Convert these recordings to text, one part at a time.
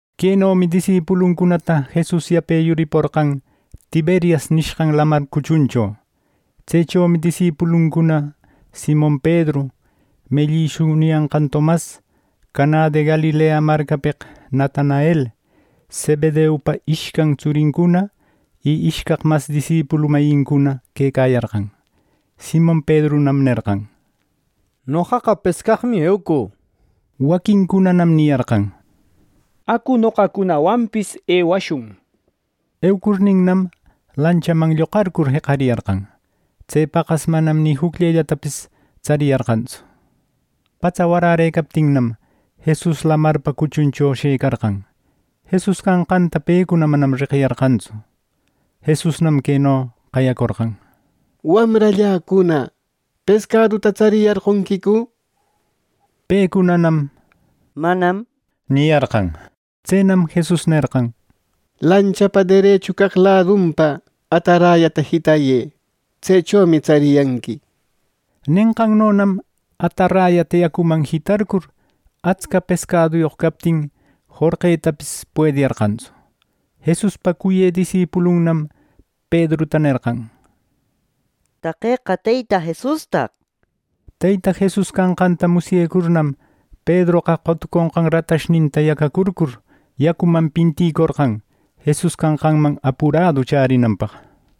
Quenomi disipuluncunata Jesus yape yuriporqan Tiberias nishqan Lamar cuchuncho. Tsechomi disipuluncuna Simon Pedru, mellïshu niyanqan Tomas, Canä de Galilea marcapeq Natanael, Zebedeupa ishcan tsurincuna y ishcaq mas disipulu mayincuna quecayarqan. Simon Pedrunam nerqan: —Noqaqa pescaqmi eucü —nir. Waquincunanam niyarqan: —Acu, noqacunawanpis ewashun. Eucurninnam, lanchaman lloqarcur, jeqariyarqan. Tse paqas manam ni jucllellatapis tsariyarqantsu. Patsa warärëcaptinnam, Jesus lamarpa cuchuncho shëcarqan. Jesus canqanta pecuna manam reqiyarqantsu. Jesusnam queno qayacorqan: —Wamralläcuna, ¿pescaduta tsariyarqonquicu? —nir. Pecunanam “Manam” niyarqan. Tsenam Jesus nerqan: —Lanchapa derechu caq ladunpa atarayata jitayë. Tsechomi tsariyanqui —nir. Nenqannonam atarayata yacuman jitarcur, atsca pescaduyoq captin, jorqetapis puediyarqantsu. Jesuspa cuyë disipulunnam Pedruta nerqan: —¡Taqeqa Teyta Jesustaq! —nir. Teyta Jesus canqanta musyecurnam, Pedroqa qotuconqan ratashninta yacacurcur, yacuman pinticorqan Jesus canqanman apuradu chärinanpaq.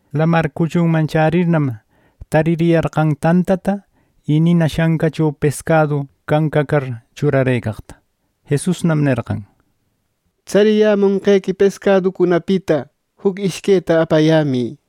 Lamar cuchunman chärirnam, taririyarqan tantata y nina shancacho pescadu cancacar churarëcaqta. Jesusnam nerqan: —Tsariyämonqequi pescaducunapita juc ishqueta apayämï —nir.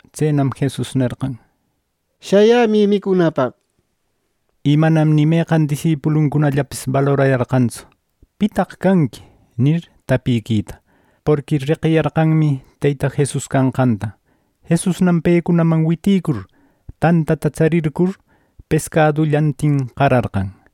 Tsenam Jesus nerqan: —¡Shayämï micunapaq! —nir. Y manam ni meqan disipuluncunallapis balorayarqantsu “¿Pitaq canqui?” nir, tapiquita, porqui reqiyarqanmi Teyta Jesus canqanta. Jesusnam pecunaman witicur, tantata tsarircur pescadullantin qararqan.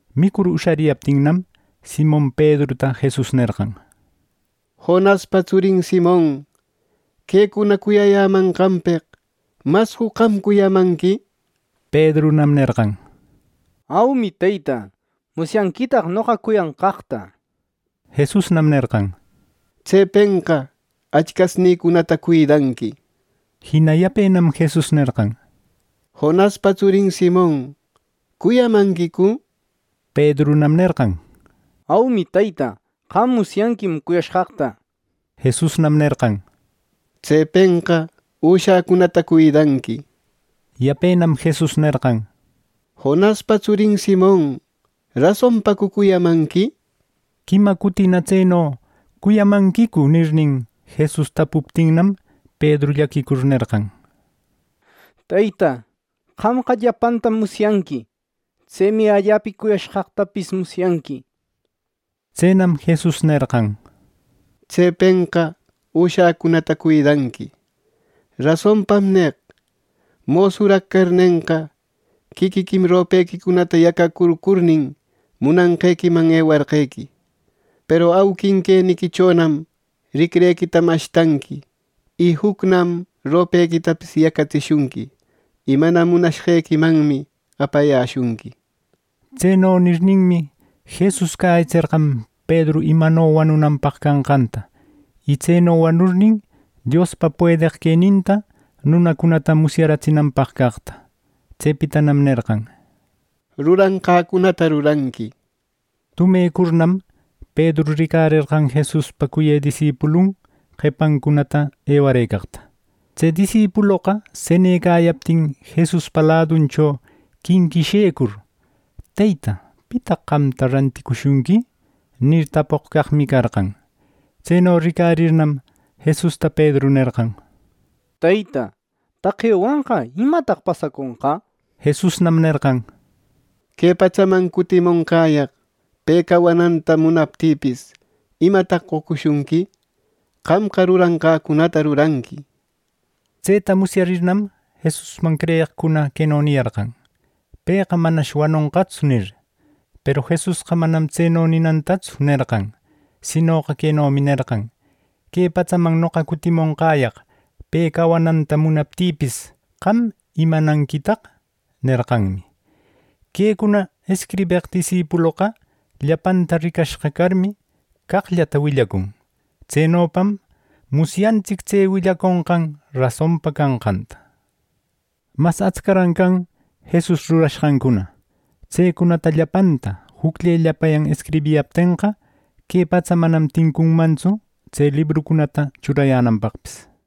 Micur ushariyaptinnam, Simon Pedruta Jesus nerqan: —Jonaspa tsurin Simon, ¿quecuna cuyayämanqanpeq mascu qam cuyamanqui? —nir. Pedrunam nerqan: —Aumi, Teyta. ¡Musyanquitaq noqa cuyanqaqta! —nir. Jesusnam nerqan: —Tsepenqa achcasnïcunata cuidanqui —nir Jina yapenam Jesus nerqan: —Jonaspa tsurin Simon, ¿cuyamanquicu? —nir. Pedrunam nerqan: —Aumi, Teyta. ¡Qam musyanquim cuyashqaqta! —nir. Jesusnam nerqan: —Tsepenqa üshäcunata cuidanqui —nir. Yapenam Jesus nerqan: —Jonaspa tsurin Simon, ¿rasonpacu cuyamanqui? —nir. Quima cutina tseno “Cuyamanquicu” nirnin, Jesus tapuptinnam, Pedru llaquicur nerqan: —Teyta, qamqa llapantam musyanqui. ¡Tsemi allapa cuyashqaqtapis musyanqui! —nir. Tsenam Jesus nerqan: —Tsepenqa üshäcunata cuidanqui. Rasonpam neq: Mosuraq carnenqa, quiquiquim ropequicunata yacacurnin, munanqequiman ewarqequi. Peru auquin queniquichonam ricrequita mashtanqui; y jucnam ropequitapis yacatsishunqui; y mana munashqequimanmi apayäshunqui —nir. Tseno nirninmi, Jesus cäyitserqan Pedru imano wanunanpaq canqanta, y tseno wanurnin, Diospa puedeq queninta nunacunata musyaratsinanpaq caqta. Tsepitanam nerqan: —Ruranqäcunata ruranqui —nir. Tumecurnam, Pedru ricarerqan Jesuspa cuyë disipulun qepancunata ewarëcaqta. Tse disipuloqa senecayaptin Jesuspa laduncho quinquishecur, “Teyta, ¿pitaq qamta ranticushunqui?” nir, tapoq caqmi carqan. Tseno ricarirnam, Jesusta Pedru nerqan: —Teyta, taqewanqa ¿imataq pasaconqa? —nir. Jesusnam nerqan: —Que patsaman cutimonqäyaq pe cawananta munaptïpis ¿imata qocushunqui! ¡Qamqa, ruranqäcunata ruranqui! —nir. Tseta musyarirnam, Jesusman creyeqcuna queno niyarqan: “Pëqa manash wanonqatsu” nir. Peru Jesusqa manam tse ninantatsu nerqan, sinoqa quenomi nerqan: “Que patsaman noqa cutimonqäyaq pe cawananta munaptïpis, ¿qam imananquitaq!” nerqanmi. Quecuna escribeq disipuloqa llapanta ricashqa carmi, caqllata willacun. Tsenopam musyantsic tse willaconqan rasonpa canqanta. Mas atscaran can Jesus rurashqancuna. Tsecunata llapanta jucllellapayan escribiyaptenqa, que patsa manam tincunmantsu tse librucunata churayänanpaqpis.